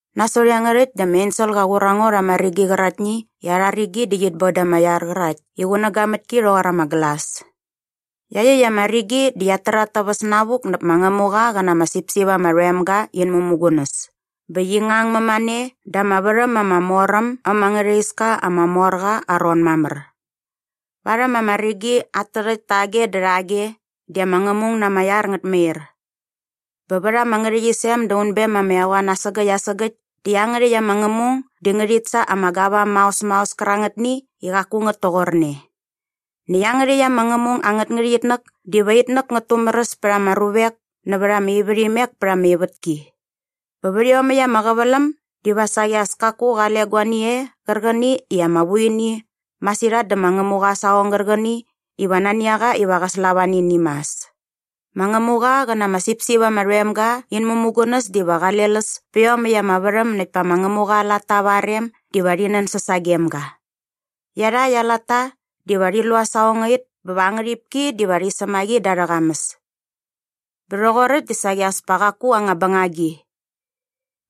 Nasot iangärhäkt dä ama ensel qa qur a ngo rha ama rigi qäraktni i arha rigi di qit bon da ama iar qärakt i qunäga mät ki rhoqor ama glas. Iaqyäkt ama rigi di qiat tär at täväs navuk näp ma Ngämuqa qä na ama sipsip ama rhoem ga in mämugunäs bä qi ngang mämane da ama värhäm ama mor äm äm angärha iska ama mor qa aa ron mamär. Varhäm ama rigi at tärhäkt tage dä rhage di ama ngämung na ama iar ngät mair. Bä vät ama ngärhäqyisem da unbem ama eqoan asägäkt asägäkt di iangärhäkt ama ngämung di ngärhit sa ama gavam maos maos kärangätni i qaku ngät toqorne. Näkt iangärhäkt ama ngämung angät ngärhäqyitnäk diva itnäk ngät tumäräs pät ama ruvek nävät ama ivärhimek pät ama ivätki. Bä vät iomäkt ama qäväläm diva saqi as kaku qale guani e qärqäni i ama vu ini masirhat dä ma Ngämuqa aa saqong gärqäni iva nani a qa iva qä slava nä ini mas. Ma Ngämuqa qä na ama sipsip ama rhoem ga in mämugunäs diva qale läs pä iomäkt ama värhäm näkt pa ma Ngämuqa aa latta va aa rem diva rhi nänsäs sagem ga. Iarhakt aa latta diva rhi lu aa saqongait bä va aa ngärhipki diva rhi säm a qi da arhä qamäs. Bä rhoqoräkt di saqi as pa qaku anga bängagi.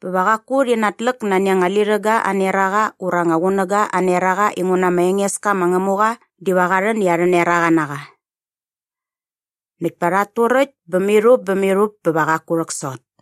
Bä va qaku rhit natläk nani anga lirhäga aa neraqa ura ama qunäga aa neraqa inguna ma Engeska ma Ngämuqa diva qa rhän i arhä neraqa na qa. Näkt pa rhat turäkt bä mirhup bä mirhup bä va qaku rhäksot.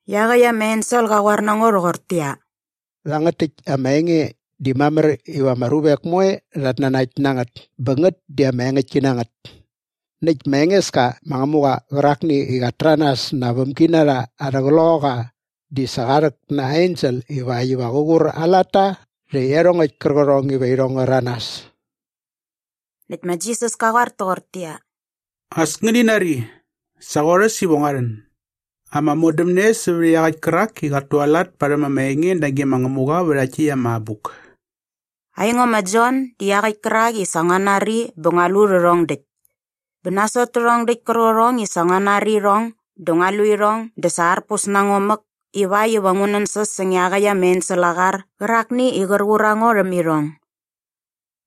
Iaqäkt ama ensel qa qoar na ngo rhoqortäqyia, “Rhangät täkt ama enge di mamär iva ama ruvek moe rhat nanakt na ngät bä ngät di sa ama engäktki na ngät. Näkt ma Engeska ma Ngämuqa qärakni qat täranas na aa vämginarha arhä qloqaqa di sa qa rhäk na aa ensel ivakt iva qä qur aa latta rhä iarhongäkt kärqärhong iva irhong ngä rhäranas.” Näkt ma Jisas ka qoar toqortäqyia, “As ngäni nari! Sa qorhäs iva ngua rhän! Ama modämne sävät iaqäkt kärak i qat tualat parhäm ama enge nage ma Ngämuqa vä rhakt täkt ama abuk.” Aingo ma Jon di iaqäkt kärak i sa ngua nari bä ngua lu rhärhong däkt. Bä nasot tärhong däkt kärqärhong i sa ngua nari irhong dä ngua lu irhong dä sa arpus na ngo mäk ivakt iva ngu nänsäs säng iaqäkt ama ensel aa qar qärakni i qär qur a ngo rhäm irhong.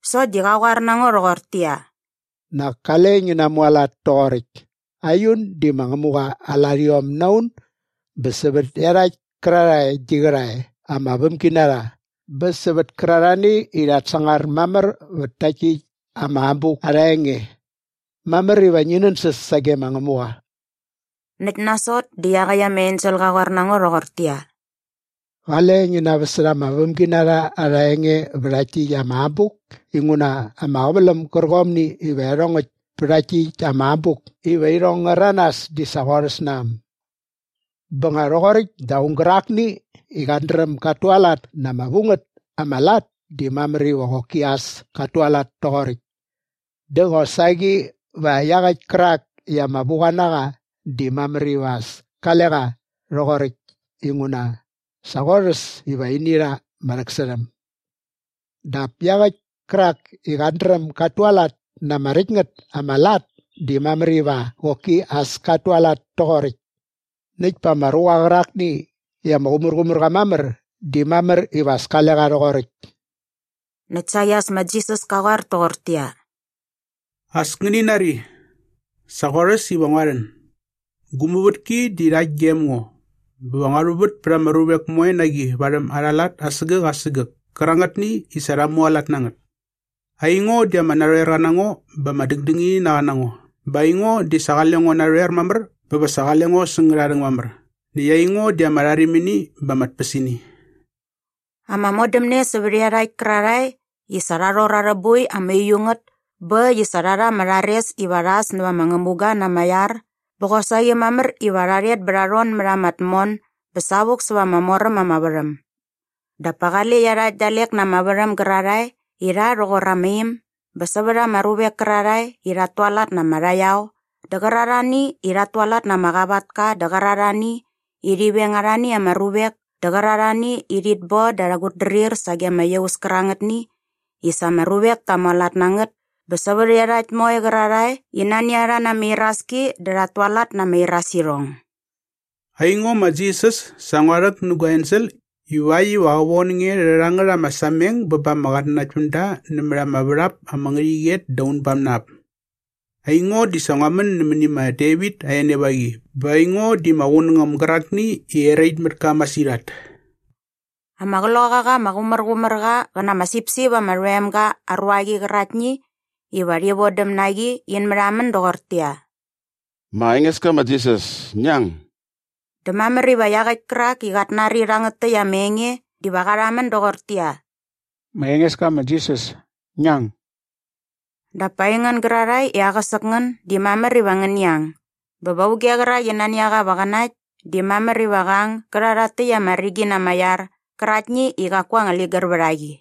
Sokt di qa qoar na ngo rhoqortäqyia, “Nak kale ngi namualat toqoräkt. Aiun di ma Ngämuqa aa larhiom na un bä sävät iarhakt kärarhae gi qärhae ama vämginarha bä sävät kärarhani i rhat sangar mamär vät takt täkt ama abuk arha enge. Mamär iva ngi nänsäs sage ma Ngämuqa.” Näkt nasot dä iaqäkt ama ensel qa qoar na ngo rhoqortäqyia, “Qale ngi naväsärha ama vämginarha arha enge vä rhakt täkt ama abuk inguna ama qäväläm gärqomni iva iarhongäkt pä rhakt täkt ama abuk iva irhong ngä rhäranas di sa qorhäs na äm. “Bä nga rhoqoräkt dä aung gärakni i qat dräm gat tualat na ama vu ngät ama lat di mamär iva qoki as kat tualat toqoräkt. Dä qosaqi va iaqäkt kärak i ama vuqa na qa di mamär iva as kale qa rhoqoräkt inguna sa qorhäs iva ini rha ama rhäksärhäm. Dap iaqäkt kärak i qat dräm gat tualat na ama räkt ngät ama lat di mamär iva qoki as kat tualat toqoräkt. Näkt pa ama ruqa qärakni i ama qumärqumär qa mamär di mamär iva as kale qa rhoqoräkt.” Näkt saqi as ma Jisas ka qoar toqortäqyia, “As ngäni nari! Sa qorhäs iva ngua rhän! Gu muvätki di rhakt gem ngo bä va ngua rhuvät pät ama ruvek moe na qi varhäm arha lat asägäk asägäk kärangätni i sa rha mualat na ngät. Aingo di ama narhoerqa na ngo bä ama dängdängininaqa na ngo. Bä aingo di sa qale ngo narhoer mamär bä sa va qale ngo säng ngärharhäng mamär. Näkt aingo di ama rharimini bä ama tpäsini.” Ama modämne sävät iarhakt kärarhae i sa rha rhor arhä boi ama uiu ngät bä äkt i sa rha rha ama rhares iva rha äs nävät ama ngämuga na ama iar bä qosaqi mamär iva rha rhet bä va rha rhon mät ama tmon bä savuk säva ama mor äm ama värhäm. Dap pa qale iarhakt dalek na ama värhäm gärarhae i rha rhoqor ama im bä sävät ama ruvek kärarhae i rhat tualat na ama rhaqyao dä qärarhani i rhat tualat na ama qavatka dä qärarhani i rhi veng arhani ama ruvek dä qärarhani i rhit bon da arhä qutdrir sage ama iaus kärangätni i sa ama ruvek ta mualat na ngät bä sävät iarhakt moe qärarhae i nani a rha na ama iraski dä rhat tualat na ama irasirhong. “Aingo ma Jisas sa ngua rhäk nä gua ensel ivakt iva qä von nge rhä rhangät ama sameng bä ba ama qatnanaktpämda nämät ama värhap ama ngärhäqyet da unbam na ap. Aingo di sa ngua män nämäni ma Devit aa enevaqi bä aingo di ma Qunängäm gärakni i erait mät ka masirhat.” Ama Qloqaqa ama Qumärqumärqa qä na ama sipsip ama rhoem ga aa ruaqi qäraktni iva rhi vodäm na qi in märhamän doqortäqyia, “Ma Engeska ma Jisas, ngi ang!” Dä mamär iva iaqäkt kärak i qat nari rhangät täkt ama enge diva qa rhamän doqortäqyia, “Ma Engeska ma Jisas, ngi ang!” Dap pa aingän gärarhae i aqäsäk ngän di mamär iva ngäni ang bä va auge qärak i nani a qa iva qä nakt di mamär iva qä ang gä rha iaqyäkt ama rigi na ama iar qäraktni i qaku anga ligär vät a qi.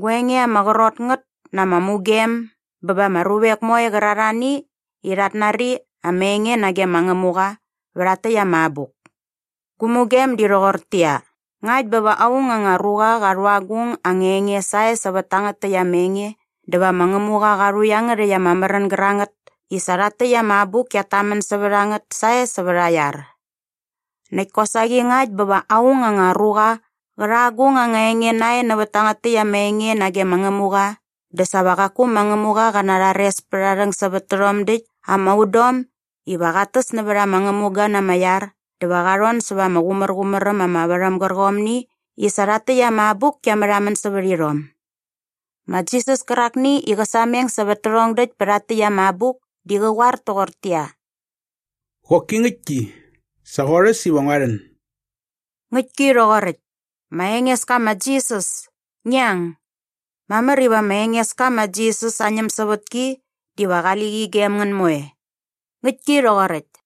Gua enge ama qrot ngät na ama mugem bä ba ama ruvek moe qärarhani i rhat nari ama enge nage ma Ngämuqa vä rhakt täkt ama abuk. Gu mugem di rhoqortäqyia, “Ngakt bä va aung anga ruqa qa rhu agung anga enge sae sävät tangät täkt ama enge dä va ma Ngämuqa qa rhu iangärhäkt ama märän gärangät i sa rhakt täkt ama abuk kiat tamän sävät a ngät sae sävät aa iar. Näkt kosaqi ngakt bä va aung anga ruqa qä rha agung anga enge nae nävät tangät täkt ama enge nage ma Ngämuqa dä sa va qaku ma Ngämuqa qä narhares pät aa rhäng sävät tärhom däkt ama udom iva qat täs nävät ama ngämuga na ama iar dä va qa rhon säva ama qumärqumär äm mamär ama värhäm gärqärhomni i sa rhakt täkt ama abuk kia märhamän sävät irhom.” Ma Jisas kärakni i qä sameng sävät tärhong däkt pä rhakt täkt ama abuk di qä qoar toqortäqyia, “Qoki ngäktki, sa qorhäs iva ngua rhän!” Ngäktki rhoqoräkt! Ma Engeska ma Jisas, ngi ang! Mamär iva ma Engeska ma Jisas aa ñämsävätki diva qali qi gem ngän moe. Ngäktki rhoqoräkt!